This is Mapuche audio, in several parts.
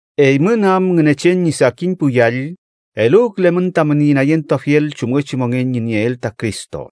Eymün am Ngünechen ñi sakin pu yall, eluwkülemün tamün inayentuafiel chumngechi mongen ñi nieel ta Cristo.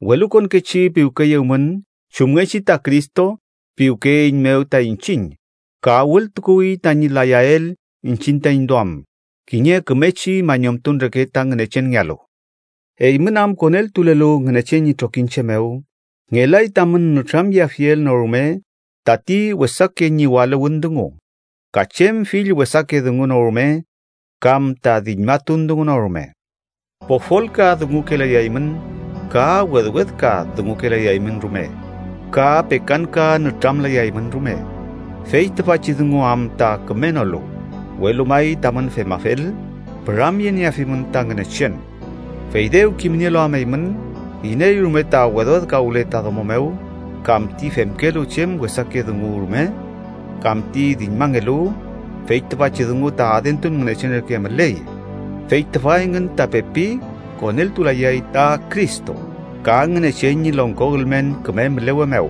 Welukonkechi piwkeyewmün, chumngechi ta Cristo piwkeyeeiñmew ta iñchiñ ka wültukuwi tañi layael iñchiñ taiñ duam, kiñe kümechi mañumtun reke ta Ngünechenngealu. Eymün am koneltulelu Ngünechen ñi trokiñche mew, ngelay tamün nütramyeafiel no rume tati wesake ñiwaluwün dungu, ka chem fill wesake dungu no rume kam ta diñmatun dungu no rume. Pofolka dungukelayaymün, ka wedwedka dungukelayaymün rume ka pekanka nütramlayaymün rume, fey tüfachi dungu am ta kümenolu. Welu may tamün femafel, püramyenieafimün ta Ngünechen. Fey dew kimnielu am eymün, iney rume ta wedwedkawle ta domo mew kam ti femkelu chem wesake dungu rume kam ti diñmangelu (fey tüfachi dungu ta adentun ngünechen reke müley), fey tüfa engün ta pepi koneltulayay ta Cristo ka Ngünechen ñi longko ülmen küme mülewe mew.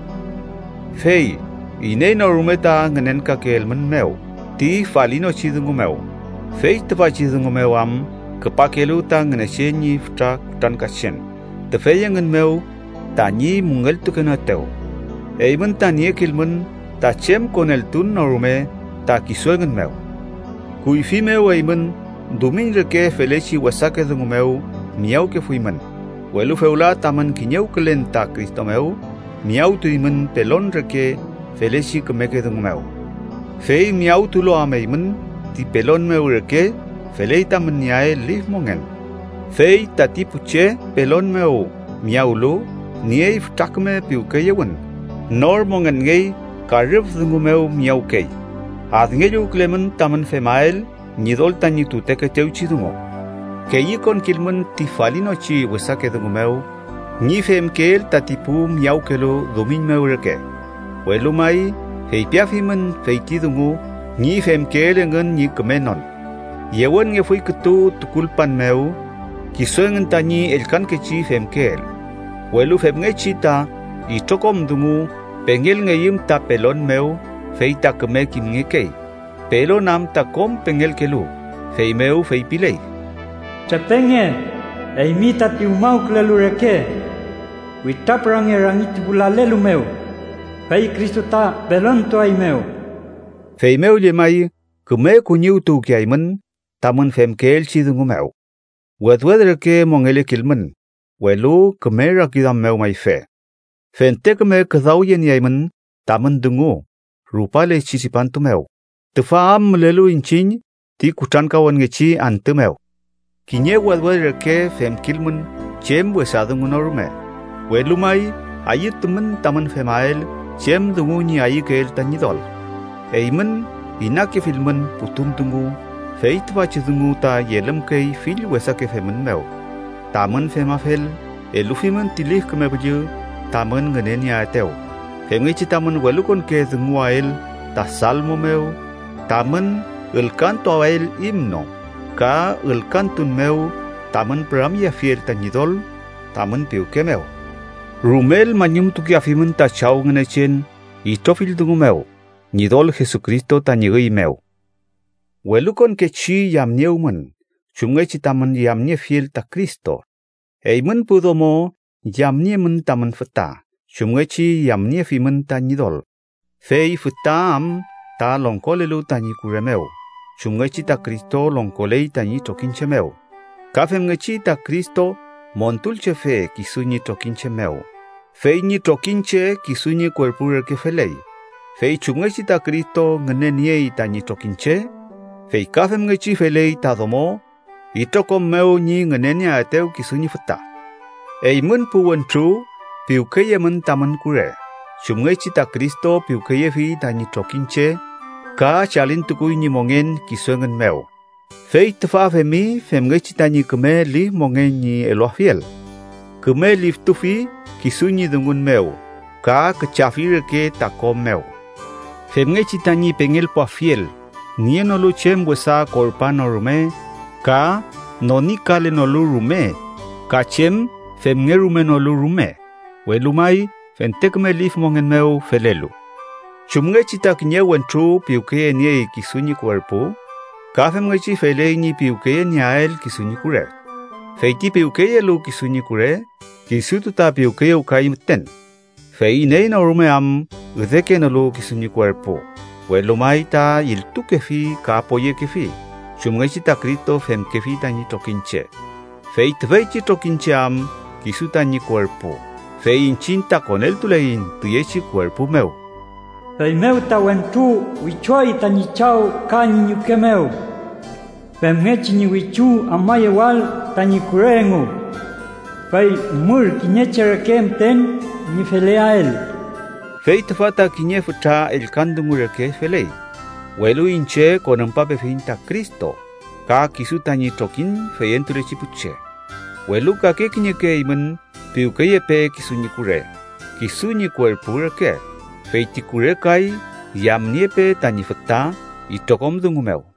Fey iney no rume ta ngünenkakeelmünmew ti falinochi dungu mew, fey tüfachi dungu mew am küpakelu ta Ngünechen ñi fütra kutrankachen tüfey engün mew tañi müngeltukenoetew. Eymün ta niekilmün ta chem koneltun no rume ta kisu engün mew. Kuyfi mew eymün dumiñ reke felechi wesake dungu mew miyawkefuymün, welu fewla tamün kiñewkülen ta Cristo mew, miyawtuymün pelon reke felechi kümeke dungu mew. Fey miyawtulu am eymün ti pelon mew reke, feley tamün nieael lif mongen, fey tati pu che pelon mew miyawlu niey fütra küme piwkeyewün, nor mongenngey ka rüf dungu mew miyawkey. Adngelluwkülemün tamün femael Ñidol tañi tutekeetewchi dungu. Keyükonkilmün ti falinochi wesake dungu mew, ñi femkeel tati pu miyawkelu dumiñ mew reke, welu may feypiafimün feyti dungu ñi femkeel engün ñi kümenon. Yewenngefuy kütu tukulpan mew kisu engün tañi ellkankechi femkeel. Welu femngechi ta itrokom dungu pengelngeyüm ta pelon mew, fey ta küme kimngekey, pelon am ta kom pengelkelu. Feymew feypiley: “Trepenge, eymi tati umawkülelu reke. Witrapürange rangi ti pu lalelu mew, fey Cristo ta pelontuaeymew.” Feymew llemay, küme kuñiwtukuwkeaymün tamün femkeelchi dungu mew. Wedwed reke mongelekilmün, welu küme rakiduam mew mayfe. Fente küme küdawyenieaymün tamün dungu rupalechi tripantu mew, tüfa am mülelu iñchiñ ti kutrankawünngechi antü mew. Kiñe wedwed reke femkilmün chem wesa dungu no rume, welu may ayütumün tamün femael chem dungu ñi ayükeel ta Ñidol. Eymün inakefilmün putun dungu, fey tüfachi dungu ta yelümkey fill wesake femün mew. Tamün femafel, elufimün ti Lif Küme Püllü tamün ngünenieaetew, femngechi tamün welukonke dunguwael ta salmo mew, tamün ülkantuael himno, ka ülkantun mew tamün püramyeafiel ta Ñidol tamün piwke mew. Rumel mañumtukeafimün ta Chaw Ngünechen itrofill dungu mew Ñidol Jesucristo tañi üy mew. Welukonkechi yamniewmün, chumngechi tamün yamniefiel ta Cristo. Eymün pu domo, yamniemün tamün füta chumngechi yamniefimün ta Ñidol. Fey füta am ta longkolelu tañi kure mew chumngechi ta Cristo longkoley tañi trokiñche mew, ka femngechi ta Cristo Montulchefe kisu ñi trokiñche mew, fey ñi trokiñche kisu ñi kuerpu reke feley. Fey chumngechi ta Cristo ngüneniey tañi trokiñche, fey ka femngechi feley ta domo itrokom mew ñi ngünenieaetew kisu ñi füta. Eymün pu wentru piwkeyemün tamün kure, chumngechi ta Cristo piwkeyefi tañi trokiñche ka chalintukuwi ñi mongen kisu engün mew. Fey tüfa femi femngechi tañi küme lif mongen ñi eluafiel. Küme liftufi kisu ñi dungun mew ka küchafi reke ta ko mew. Femngechi tañi pengelpuafiel nienolu chem wesa korpa no rume ka nonikalenolu rume ka chem femngerumenolu rume, welu may fente küme lif mongen mew felelu. Chumngechi ta kiñe wentru piwkeyeniey kisu ñi kuerpu, ka femngechi feley ñi piwkenieael kisu ñi kure. Fey ti piwkeyelu kisu ñi kure, kisutu ta piwkeyewkay müten. Fey iney no rume am üdekenolu kisu ñi kuerpu, welu may ta iltukefi ka poyekefi, chumngechi ta Cristo femkefi tañi trokiñche. Fey tüfeychi trokiñche am kisu tañi kuerpu. Fey iñchiñ ta koneltuleiñ tüyechi kuerpu mew. “Feymew ta, wentru wichuay tañi chaw ka ñi ñuke mew, femngechi ñi wichu amayewael tañi kure engu, fey mür kiñe che reke müten ñi feleael.” Fey tüfa ta kiñe fütra ellkan dungu reke feley, welu iñche konümpapefiñ ta Cristo ka kisu tañi trokiñ feyentulechi pu che. Welu kake kiñeke eymün piwkeyepe kisu ñi kure, kisu ñi kuerpu reke, fey ti kure kay yamniepe tañi füta itrokom dungu mew.